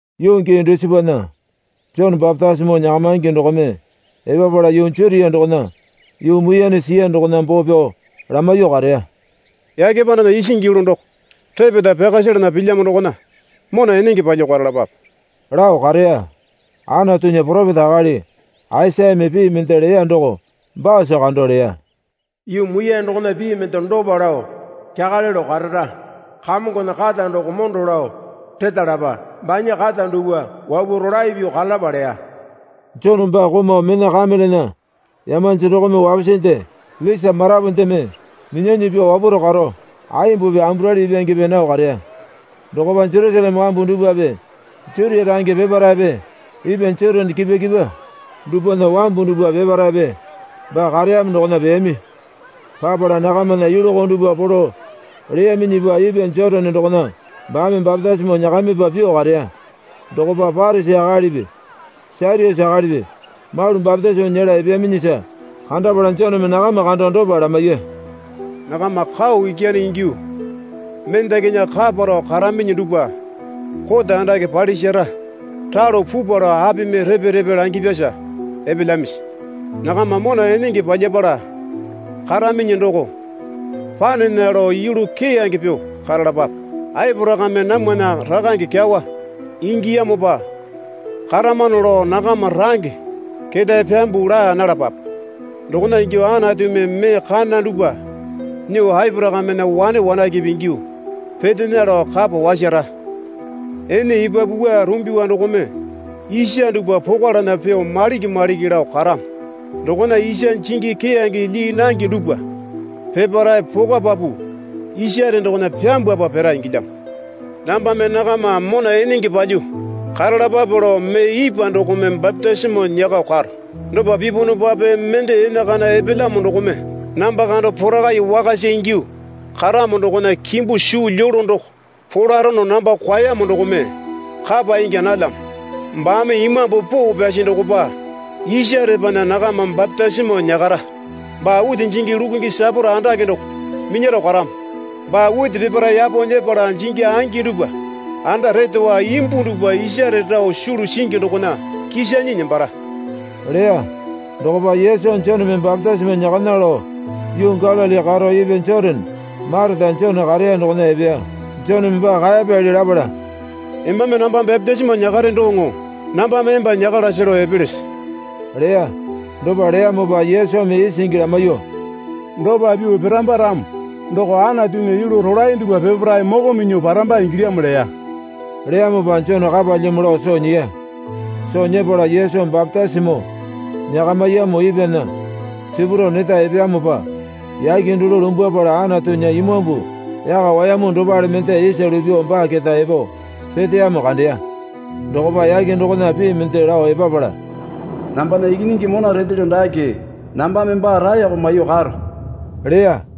Yuu gii dusipana Jone bapitisimo nyakamaingi dokome epapala yuu Jutia dokona yuu muiyane siya dokona boo pyao lamaiyuo kareya. Yake pandana isingi yulu doko repeta pyaka selana pilyamo dokona mona enenge palyuo karalapape lao kareya. Anatunya poropeta akali Aisayame pii mende leya doko baasa kando leya. Yuu muiyane dokona pii mende dopa lao kyakale lao karara, Kamongona kata doko mondo lao retalapa, banya kata dupwa wapuo rolae pyuo karalapa, leya. Jone baa komau mena kamelena yamanji dokome wapusinde lisa marapu mendeme minyanyi pyuo wapwaro karo aimbupi amburali ipwangepe nao kareya. Dokopa Jerusaleme wambu dupwape Jutia range peparaepe ipwa Jotane kipwa kipwa dupwana wambu dupwa peparaepe baa kareyamo dokona peyami. Papala nakamana yulu koo dupwa polo leyaminyipa ipwa Jotane dokona baame bapitisimo nyakamipa pyuo kareya. Dokopa Parisi akalipi Satyusi akalipi malu bapitisimo nyela epeyaminyisa kandapala Joneme nakama kando dopa lamaiya. Nakama kau ikyane ingyuo mendakinya kaparao karaminyi dupwa kote andake palisara ralo pupwa lao apimi repe repe langipyasa epelyamisi? Nakama mona enenge palyapala karaminyi doko panena lao yulu keyange pyuo karalapape. Aporakame namwana rakange kyawa ingiyamopa karamano lao nakama range ketae pyambuo laa nalapape. Dokona ingyuo Anatumi mee kana dupwa nyuo Aporakamena wane wanakepe ingyuo petena lao kapa wasara. Ene epapu wua rumbiwa dokome isa dupwa pokwalana pyuo maliki maliki lao karamo. Dokona isa jingi keyange lyii nange dupwa peparae pokwapapu isare dokona pyambwapa pira ingilyamo. Nambame nakama mona enenge palyuo karalapape lao mee ipwa dokome bapitisimo nyakao karo. Dopa pipunupape mende enakana epelyamo dokome namba kando porakai wakasa ingyuo karamo dokona kimbu suu lyolo doko polarono namba kwaeyamo dokome kapa ingya nalyamo. Baame Imambu Poo Pyasi dokopa isarepana nakama bapitisimo nyakara. Baa witi jingi lukungi saporo andake doko minyaro karamo. Baa witi peparae yapo nyepala jingi angi dupwa anda retowa, imbu dupwa isare rao sulu singi dokona kisanyi nembara leya. Dokopa Yesu Joneme bapitisimo nyakana lao yuu Galili karo ipwa Jotane mareta Jone kareya dokona epeya. Joneme baa kaeyapyali lapala, Embame namba bapitisimo nyakare doŋo nambame emba nyakalase lao epelese? leya. Dopa leyamopa Yesumi isingi lamaiyuo, Dopa pyuo piramba ramo doko Anatunya yulu rolae dupwa peparae moko minyuo paramba ingilyamo leya. Leyamopa Jone kapalyamo lao soo nyiya. Soo nyepala Yesu bapitisimo nyakamiyamo ipwana sipurao neta epeyamopa yake dulu lumbwapala Anatunya Imambu yaka wayamu dopale mende isa lupyuo baa keta epo peteyamo kandeya. Dokopa yake dokona pii mende lao epapala, Nambana Ikinyingi mona retelyo dake. Nambame baa raeko maiyuo karo leya.